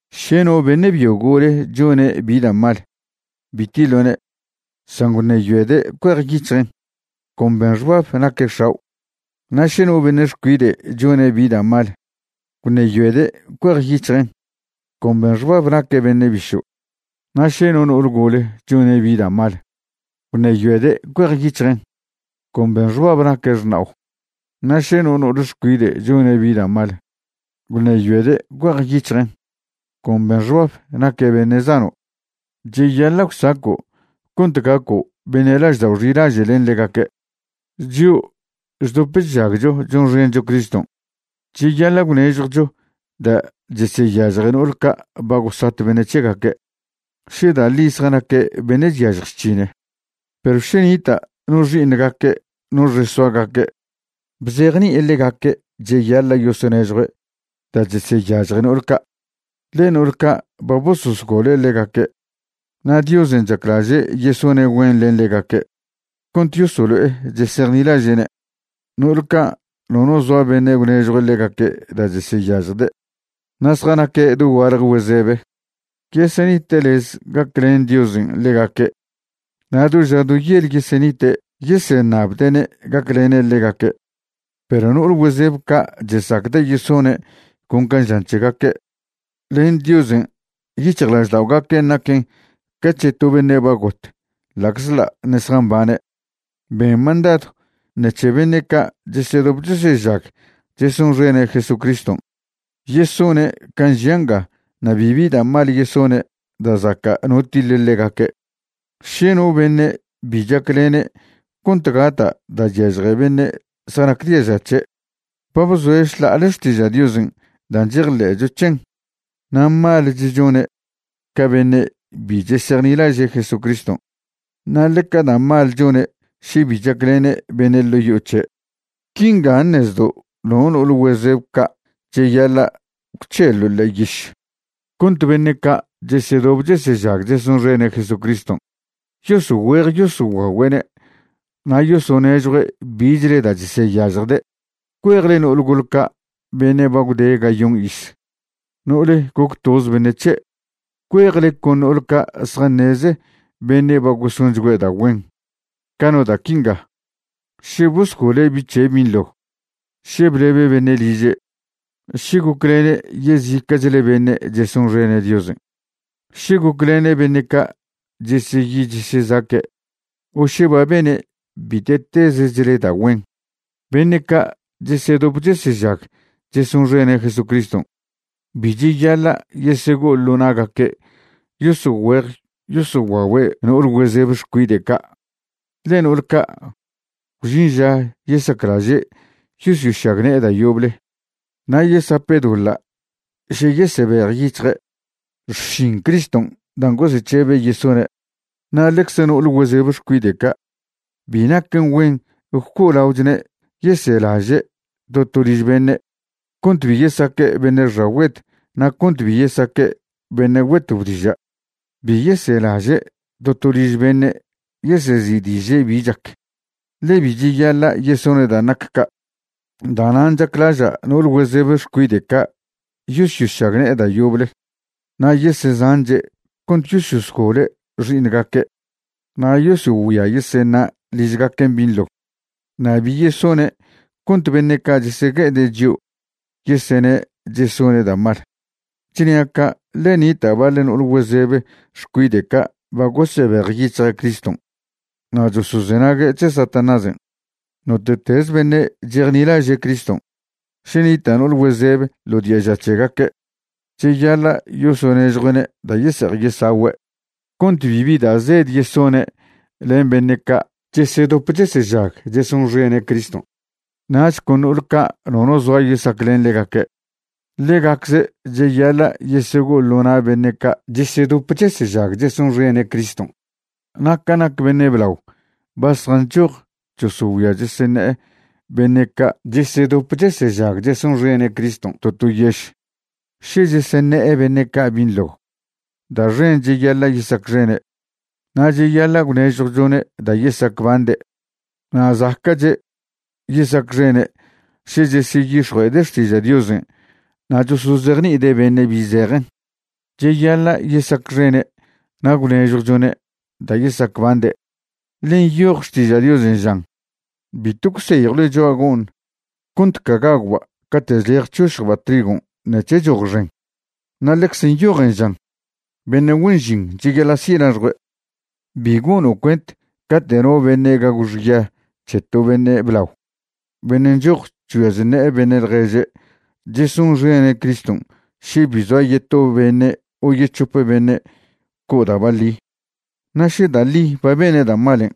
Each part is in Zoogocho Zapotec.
Še no beṉe' byo gole chone' bi da' mal, bi tiḻo'ne', san gwṉeyoede' cuejyic̱hjen', con ben xbab naque' x̱ao'. Na' še no beṉe' xcuide' chone' bi da' mal, gwṉeyoede' cuejyic̱hjen', con ben xbab naque' beṉe' bišo'. Na' še no no'ol gole chone' bi da' mal, gwṉeyoede' cuejyic̱hjen', con ben xbab naque' xṉao'. Na' še no no'ol xcuide' chone' bi da' mal, gwṉeyoede' cuejyic̱hjen', con ben xbab naque' beṉe' zano'. Cheyaḻa' gwsaco' cont gaco' beṉe' laždao' xilaže' len ḻegaque'. Chio' chdop chžagcho chonxencho Criston' cheyaḻa' gwnežjwcho da' cheseyažje no'ol ca' ba gosat beṉe' c̱hegaque' še da' ḻi zjanaque' beṉe' chyažj chc̱hine. Perw še nita' no xi'iṉgaque' no xesoagaque', bzejni'ide' ḻegaque' cheyaḻa' yosonežjue' da' cheseyažje no'ol ca', ḻe no'ol ca' ba bososgole' ḻegaque', na' Diosen' chaclaže' yesone' güen len ḻegaque' cont yosolo'e chesejnilaže'ne'. No'ol ca' nono zoa beṉe' gwnežjw ḻegaque' da' cheseyažjde' na' zjanaque' dogualje güezebe, yesenite' lez gaclen Diosen' ḻegaque' na' do ža do yel yesenite' yeseṉabde'ne' gaclene' ḻegaque'. Perw no'ol güezeb ca' chesacde' yesone' con ca žan c̱hegaque', len Diosen' yic̱hjlažda'ogaquen' naquen ca c̱he to beṉe' ba got ḻa'czḻa' ṉe' zjambane'. Ben mandadw ṉec̱he beṉe' ca' chesedop chesežag chesonxene' Jesucriston' yesone' can' žia' nga na' bibi da' mal yesone' da' zaca' no tiḻe ḻegaque'. Še no beṉe' bi chaclene' cont gata' da' chyažje beṉe' zjanac diaža c̱he', ba bzoe' šḻa'ale xtiža' Diosen' dan' chejḻe'cho c̱hen, na' malech chone' ca beṉe' bi chesejnilaže' Jesucriston'. Na' ḻeca da' mal chone' še bi chaclene' beṉe' ḻo' yo'o c̱he'. Quinga ṉezdo' no no'ol güezeb ca' cheyaḻa' gwc̱helo' ḻe'e yiš cont beṉe' ca' chesedop chesežag chesonxene' Jesucriston' yosogüe'ej yosoguagüe'ne' na' yosonežjue' bichle da' cheseyažjde'. Cuejle no'ol gol ca' beṉe' ba gwde gayon iz, no'ole goc toze beṉe' c̱he'. Cuejle con no'ol ca' zjaṉeze beṉe' ba gosonchgüe' da' güen, ca no da' quinga: še bosgole' bi' c̱he' binḻo, še blebe' beṉe' liže', še goclene' yezica'chle beṉe' chesonxene' Diosen', še goclene' beṉe' ca' cheseyi chesezaque', o še ba bene' bite'tezechle da' güen. Beṉe' ca' chesedop chesežag chesonxene' Jesucriston' bi cheyaḻa' yesego'o ḻo na'gaque' yosogüe'ej yosoguague' no'ol güezeb xcuide' ca'. Ḻe no'ol ca', gwžin ža yesaclaže' yosyošagne'e da' yoble, na' yesape' doḻa' še yesebejyic̱hje' xšin Criston' dan' gosec̱hebe' yesone'. Na' ḻecze no'ol güezeb xcuide' ca' bi naquen güen gwco'olaochwne' yeselaže' to to liž beṉe', cont bi yesaque' beṉe' xagüed, na' cont bi yesaque' beṉe' güetob diža'. Bi yeselaže' to to liž beṉe' yesezi'diže' bi chac, ḻe bi cheyaḻa' yesone' dan' nac ca'. Da'nan' chaclaža' no'ol güezeb xcuide' ca' yosyošagne'e da' yoble na' yesezanche' cont yosyosgole' xi'iṉgaque' na' yosogüia yeseṉa' ližgaquen' binḻo, na' bi yesone' cont beṉe' ca' chesegue'ede' chio' yesene' chesone' da' mal. Chnia' ca' ḻe nita' baḻ no'ol güezeb xcuide' ca' ba gosebejyic̱hje' Criston' na' chosozenague' c̱he Satanásen'. Note'tez beṉe' chejnilaže' Criston', še nita' no'ol güezeb ḻo diaža c̱hegaque', cheyaḻa' yosonežjue'ne' da' yese'ej yesagüe' cont bibi da' zed yesone' len beṉe' ca' chesedop chesežag chesonxene' Criston'. Nach con no'ol ca' nono zoa yesaclen ḻegaque', ḻegacze' cheyaḻa' yesego'o ḻo na' beṉe' ca' chesedop chesežag chesonxene' Criston'. Na' ca nac beṉe' blao ba zjanchoj chosogüia cheseṉe'e beṉe' ca' chesedop chesežag chesonxene' Criston' to to yež, še cheseṉe'e beṉe' ca' binḻo, da' xen cheyaḻa' yesacxene', na' cheyaḻa' gwnežjwchone' da' yesacbande'. Na' zaca'che' yesacxene' še cheseyix̱jue'ede' xtiža' Diosen' na' chosozejni'ide' beṉe' bi zejen. Cheyaḻa' yesacxene' na' gwnežjwchone' da' yesacbande', ḻe nyoj Xtiža' Diosen' žan: “Bitw gwseyjwle cho'a go'ṉ cont ca gagwba' cate' chlej chšošjba' trigon' nec̱he choj xen'.” Na' ḻecz nyojen žan: “Beṉe' güen žin cheyaḻa' si' laxjue'.” Bi gono' cuent cate' no beṉe' gagw xya c̱he to beṉe' blao beṉe' nchoj chgüia chṉe'e beṉe' ḻježe' chesonxene' Criston' še bi zoa yeto beṉe' o yec̱hope beṉe' co' da' baḻi. Na' še da' ḻi ba bene' da' malen',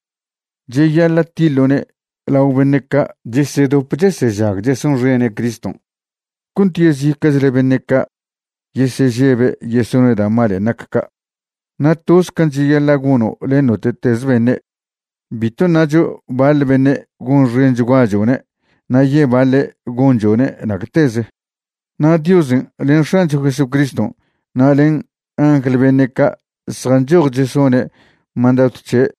cheyaḻa' tiḻo'ne' lao beṉe' ca' chesedop chesežag chesonxene' Criston' cont yezica'chle beṉe' ca' yesežebe' yesone' da' malen' nac ca'. Na' toze can' cheyaḻa' gono' len note'teze beṉe', bitw ṉacho baḻ beṉe' gonxenchguachone' na' yebaḻe' gonchone' nacteze. Na' Diosen' len X̱ancho Jesucriston' na' len angl beṉe' ca' zjanchoj chesone' mandadw c̱he'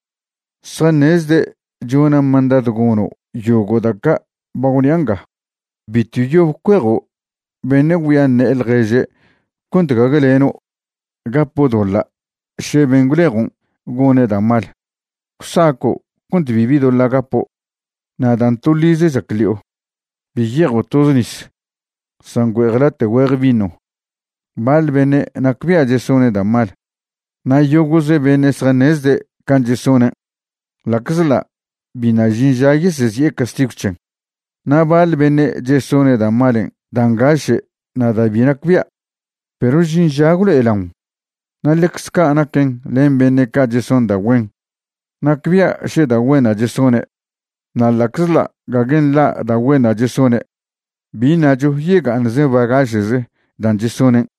zjaṉezde' chona' mandadw gono' yogo' da' ca' ba gwnia' nga. Bitw yob cuejo' beṉe' güia ṉe'e ḻježe' cont gague leno' gapo' doḻa' še ben' gwlejon' gone' da' mal. Gwsaco' cont bibi doḻa' gapo'. Na' dan' toḻize chac ḻi'o, bi ye'ejo' toze nis, san güe'ej late' güeje vino. Baḻ beṉe' nacbia' chesone' da' mal na' yogo'ze beṉe' zjaṉezde' can' chesonen' ḻa'czḻa' biṉa' žin ža yesezi'e castigw c̱hen. Na' baḻ beṉe' chesone' da' malen' dan' ngaše' na' da' bi nacbia', perw žin ža gwlo'elaon. Na' ḻecz ca' naquen len beṉe' ca' cheson da' güen, nacbia' še da' güenṉa' chesone', na' ḻa'czḻa' gague nḻa' da' güenṉa' chesone', bi ṉacho yega'aṉcze bagaše'ze dan' chesonen'.